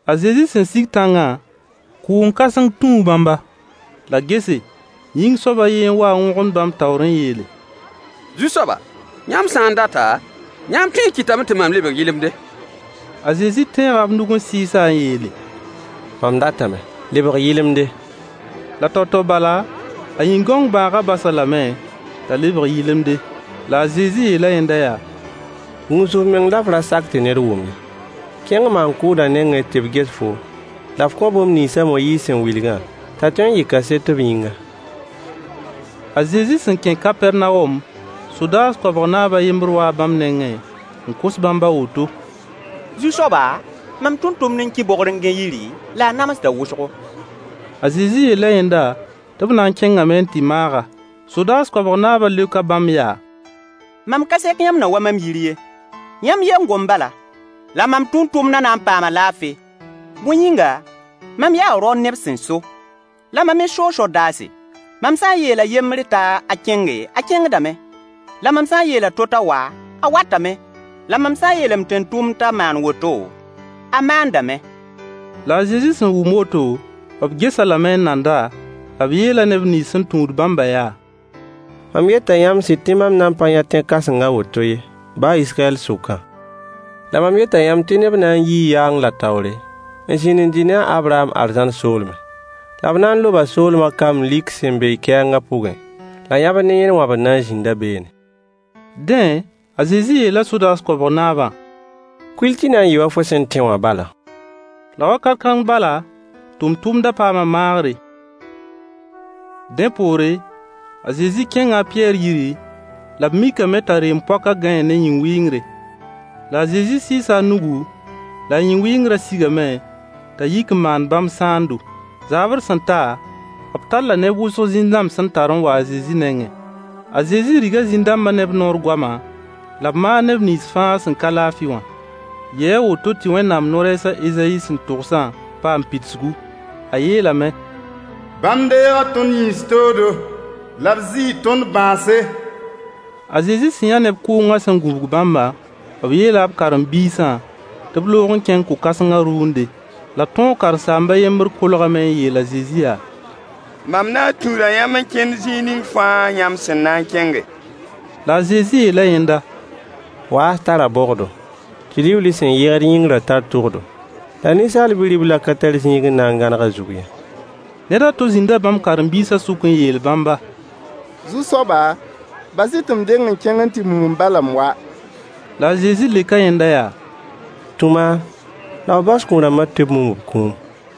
A Zezi sẽn sig tãngã, kʋʋng-kãseng tũu bãmba. La gese, yĩng-soab a yen n wa n wõgemd bãmb taoor n yeele: Zu-soaba, yãmb sã n data, yãmb tõe n kɩtame tɩ mam lebg yɩlemde. A Zezi tẽega b nug n sɩɩs-a n yeele: Mam datame. Lebg yɩlemde. La tao-tao bala a yĩn-gãong bãagã bas-a lame t'a lebg yɩlemde. La a Zezi yeela yẽnda yaa: Gũus f meng la f ra sak tɩ ned wʋm ye. Kẽng maan-kʋʋdã nengẽ tɩ b ges foom, la f kõ bũmb nins a Moyiis sẽn wilgã, t'a tõe n yɩ kaset b yĩnga. A Zezi sẽn kẽ Kapɛrnawom, sodaas koabg naab a yembr waa bãmb nengẽ n kos bãmb a woto: Zu-soaba, mam tʋmtʋmd n ki bogr n gãe yiri, la a namsda wʋsgo. A Zezi yeela yẽnda tɩ b na n kẽngame n tɩ maag-a. Sodaas koabg naabã leoka bãmb yaa: Mam ka sek yãmb na wa mam yir ye. Yãmb ye n gom bala, la mam tʋmtʋmdã na n paama laafɩ. Bõe yĩnga, mam yaa rao neb sẽn so, la mam me soo sodaase. Mam sã n yeel a yembr t'a kẽnge, a kẽngdame. La mam sã n yeel a to t'a wa, a watame. La mam sã n yeel m tʋmtʋmd t'a maan woto, a maandame. La a Zezi sẽn wʋm woto, b ges-a lame n nand-a, la b yeela neb nins sẽn tũud bãmbã yaa: Mam yeta yãmb sɩd tɩ mam nan pa yã tẽ-kãseng a woto, baa Israyɛl sʋkã ye. La mam yeta yãmb tɩ neb n na n yi yaang la taoore, n zĩnd n dɩ ne a Abraham arzãn soolmẽ. La b na n loba soolmã kamb lik sẽn be kɛɛngã pʋgẽ, la yãbr ne yẽn wãbr na n zĩnda beene. Dẽ, a Zezi yeela sodaas koabg naabã: Kuil tɩ na n yɩɩ wa fo sẽn tẽ wã bala. La wakat kãng bala tʋmtʋmdã paama maagre. Dẽ poore, a Zezi kẽnga a Pɩyɛɛr yiri, la b mikame t'a reem-poakã gãee ne yĩn-wɩngre. La a Zezi sɩɩsa a nugu, la a yĩn-wɩngrã sigame t'a yik n maan bãmb sãando. Zaabr sẽn ta, b talla neb wʋsg zĩn-dãmb sẽn tar n wa a Zezi nengẽ. A Zezi riga zĩn-dãmbã ne b noor goama, la b maag neb nins fãa sẽn ka laafɩ wã. Yɩɩ a woto tɩ Wẽnnaam no-rɛɛs a Ezayi sẽn togsã paam pidsgu. A yeelame: Bãmb deega tõnd yĩns toodo, la b zɩɩ tõnd bãase. A Zezi sẽn yã neb kʋʋngã sẽn gũbg bãmbã, b yeela b karen-biisã tɩ b loog n kẽng ko-kãsengã rʋʋnde. La tõog karen-saamb a yembr kolgame n yeel a Zezi yaa: Mam na n tũuda yãmb n kẽnd zĩig ning fãa yãmb sẽn na n kẽnge. La a Zezi yeela yẽnda: Waas tara bogdo, tɩ liuuli sẽn yɩgd yĩngrã tar tʋgdo, la Ninsaal Bi-riblã ka tar zĩig n na n gãneg a zug ye. Ned a to zĩnda bãmb karen-biisã sʋk n yeel bãmba: Zu-soaba, bas-y tɩ m deng n kẽng n tɩ mum m ba la m wa. La a Zezi leoka yẽnda yaa: Tũ maam, la f bas kũ-rãmbã tɩ b mum b kũum.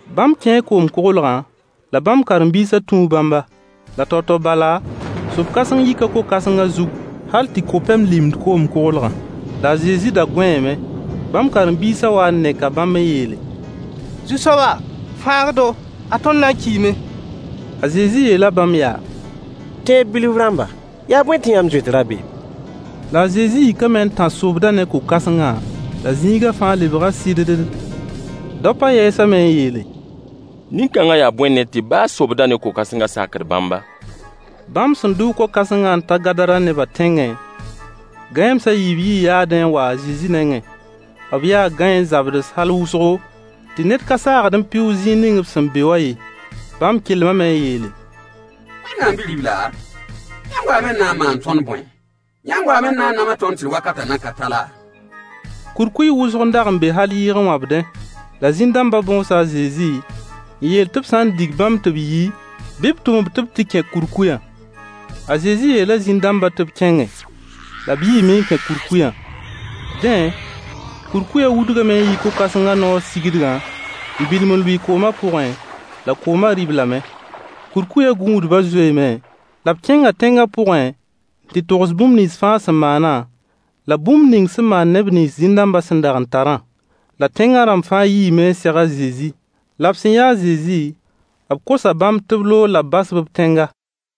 Bãmb kẽe koom-koglgã, la bãmb karen-biisã tũu bãmba. La tao-tao bala sob-kãseng yika ko-kãsengã zug hal tɩ ko-pɛm limd koom-koglgã. La a Zezi da gõeeme. Bãmb karen-biisã wa n neka bãmb n yeele: Zu-soaba, fãag-y-do! Ad tõnd na n kiime! A Zezi yeela bãmb yaa: Tẽeb bilf rãmba, yaa bõe tɩ yãmb zoet rabeem? La a Zezi yikame n tãs sobdã ne ko-kãsengã, la zĩiga fãa lebga sɩddd. Daopã yɛɛsame n yeele: Nin-kãngã yaa bõe ned tɩ baa sobdã ne ko-kãsengã sakd bãmba? Bãmb sẽn dʋʋg ko-kãsengã n ta Gadara neba tẽngẽ, gãeems a yiib yii yaadẽ n wa a Zezi nengẽ. B yaa gãeen-zabds hal wʋsgo, tɩ ned ka saagd n pɩʋʋg zĩig ning b sẽn be wã ye. Bãmb kelmame n yeele: Wẽnnaam Bi-ribla, yãmb waame n na n maan tõnd bõe? Yãmb waame n na n nams tõnd tɩ wakatã nan ka ta laa? Kurkuy wʋsg n dag n be hal yɩɩg n wãbdẽ. La zĩn-dãmbã bõosa a Zezi n yeel tɩ b sã n dig bãmb tɩ b yi, bɩ b tʋm-b tɩ b tɩ kẽ kurkuyã. A Zezi yeela zĩn-dãmbã tɩ b kẽnge. La b yiime n kẽ kurkuyã. Dẽ, kurkuyã wudgame n yi ko-kãsengã noor sigdgã n bilim n lʋɩ koomã pʋgẽ, la koomã rɩ-b lame. Kurkuyã gũudbã zoeeme, la b kẽnga tẽngã pʋgẽ n tɩ togs bũmb nins fãa sẽn maanã, la bũmb ning sẽn maan neb nins zĩn-dãmbã sẽn dag n tarã. La tẽngã rãmb fãa yiime n seg a Zezi. La b sẽn yã a Zezi, b kosa bãmb tɩ b loog la b bas-b b tẽnga.